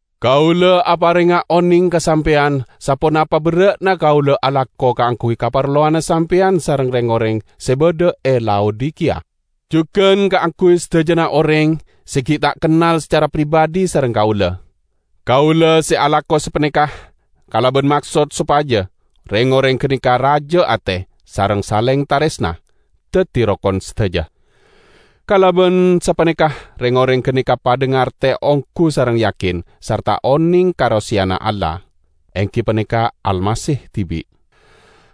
Kaula aparenga oneng ka sampeyan saponapa berra'na kaula alako kaangguy kaparlowanna sampeyan sareng reng-oreng se badha e Laodikiya, jugan kaangguy sadajana oreng se gi' ta' kennal sacara pribadhi sareng kaula. Kaula se alako sapaneka kalaban maksod sopaja reng-oreng ganeka raja ate, sareng saleng taresna; daddi rokon sadaja. Kalaban sapaneka reng-oreng ganeka padha ngarte onggu sareng yakin sarta oneng ka roseyana Allah, enggi paneka Almasih dibi'.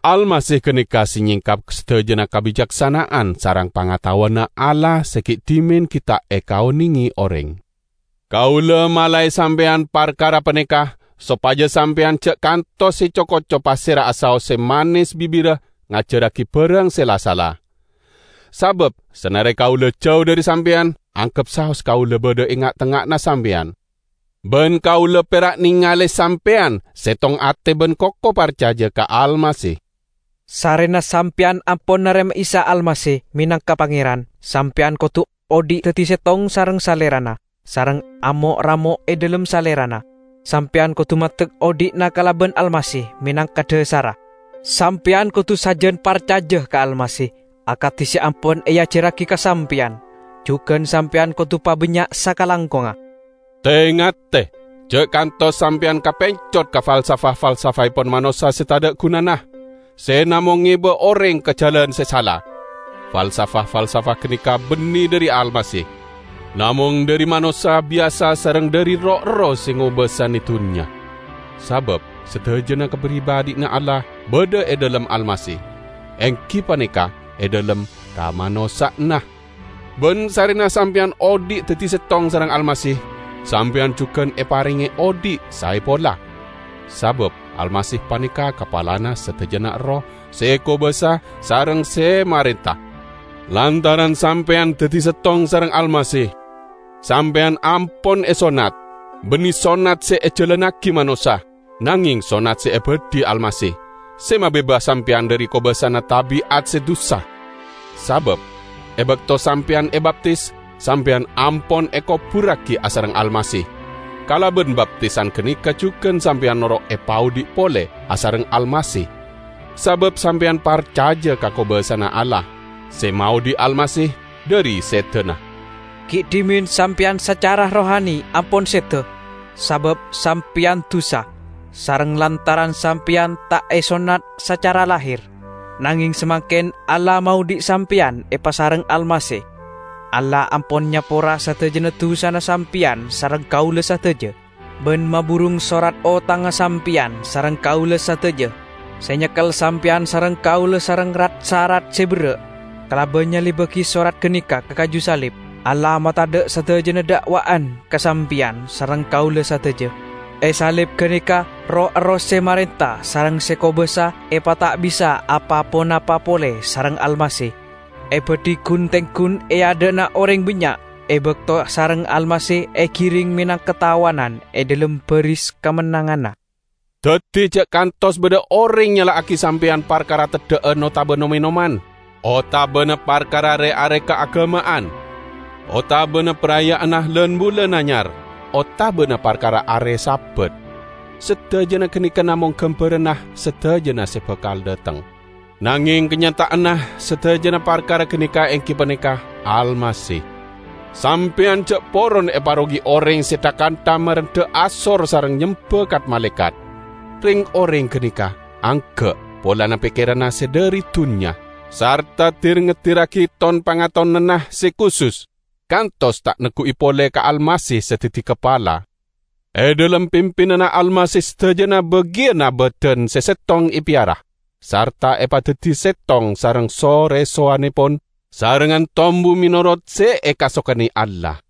Almasih ganeka se nyengkap sadajana kabicaksana'an sareng pangataowanna Allah se gi' dhimen gi' ta' ekaonenge oreng. Kaula malae sampeyan parkara paneka sopaja sampeyan ja' kantos eco-koco pasera'a saos se manes bibirra ngajarragi barang se la-sala. Sabab sanare kaula jau dhari sampeyan, anggep saos kaula badha e nga'-tengnga'anna sampeyan. Ban kaula perak nengale sampeyan settong ate ban koko parcaja ka Almasih. Sarrena sampeyan ampon narema Isa Almasih menangka Pangeran, sampeyan kodu odhi' daddi settong sareng Salerana, sareng amo'-ramo' e dhalem Salerana; sampeyan kodu maddek odhi'na kalaban Almasih menangka dhasarra. Sampeyan kodu sajan parcaja ka Almasih, akadi se ampon eajarragi ka sampeyan. Jugan sampeyan kodu pabannya' sakalangkongnga. Te-ngate, ja' kantos sampeyan kapencot ka falsafah-falsafahepon manossa se tadha' gunana, se namong ngeba oreng ka jalan se sala. Falsafah-falsafah ganeka banne dhari Almasih, namong dhari manossa biyasa sareng dhari roh-erroh se ngobasane dunnya. Sabab sadajana kapribadhiyanna Allah badha e dhalem Almasih, enggi paneka e dhalem kamanossa'anna. Ban sarrena sampeyan odhi' daddi settong sareng Almasih, sampeyan jugan eparenge odhi' saeppolla. Sabab Almasih paneka kapalana sadajana erroh se kobasa sareng se marenta. Lantaran sampeyan daddi settong sareng Almasih, sampeyan ampon esonnat, banne sonnat se ejalannagi manossa, nangeng sonnat se ebadhi Almasih, se mabebas sampeyan dhari kobasana tabi'at se dusa. Sabab e bakto sampeyan ebaptis, sampeyan ampon ekoburragi asareng Almasih; kalaban baptisan ganeka jugan sampeyan noro' epaodhi' pole asareng Almasih sabab sampeyan parcaja ka kobasana Allah, se maodhi' Almasih dhari sedana. Gi' dhimen sampeyan sacara rohani ampon seda, sabab sampeyan dusa, sareng lantaran sampeyan ta' esonnat sacara lahir. Nangeng samangken Allah maodhi' sampeyan epasareng Almasih. Allah ampon nyapora sadajana dusana sampeyan sareng kaula sadaja, ban maburung sorat otangnga sampeyan sareng kaula sadaja, se nyekkel sampeyan sareng kaula sareng rat-sarat se berra'. Kalaban nyalibbagi sorat ganeka ka kaju salib, Allah matadha' sadajana da'wa'an ka sampeyan sareng kaula sadaja. E salib ganeka roh-erroh se marenta sareng se kobasa epata'bisa apa-ponapa pole sareng Almasih, ebadhi gun-tenggun e adha'na oreng bannya' e bakto sareng Almasih egiring menangka tawanan e dhalem baris kamennanganna. Daddi ja' kantos badha oreng nyala'agi sampeyan parkara teddha'an otaba nom-enoman, otabana parkara re-are kaagama'an, otabana paraya'anna lan-bulan anyar, otabana parkara are Sabat. Sadajana ganeka namong gambaranna sadajana se bakal dhateng, nangeng kanyata'anna sadajana parkara ganeka enggi paneka Almasih. Sampeyan ja' poron eparogi oreng se tha-kantha marendha asor sareng nyemba kat-malaekat. Reng-oreng ganeka angga' polana pekkeranna se dhari dunnya, sarta dir-ngedirragi ton-pangatonanna se kusus, kantos ta' neggu'i pole ka Almasih se daddi kapala. E dhalem pimpinanna Almasih sadajana bagiyanna badan se settong epeyara, sarta epadaddi settong sareng so-resowannepon, sarengngan tombu menorot se ekasokane Allah.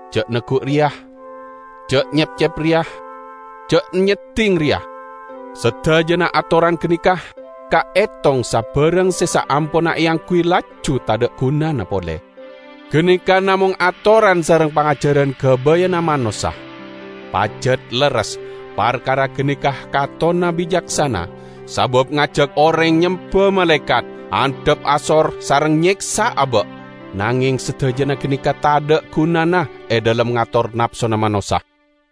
"Ja' neggu' reya", "Ja' nyepcep reya", "Ja' nyedding reya"? Sadajana atoran ganeka, kaetong sabarang se saamponna eangguy laju tadha' gunana pole. Ganeka namong atoran sareng pangajaran gabayanna manossa. Pajat lerres parkara ganeka katonna bicaksana, sabab ngajak oreng nyemba malaekat, andhap asor sareng nyeksa aba'; nangeng sadajana ganeka tadha' gunana e dhalem ngator napsona manossa.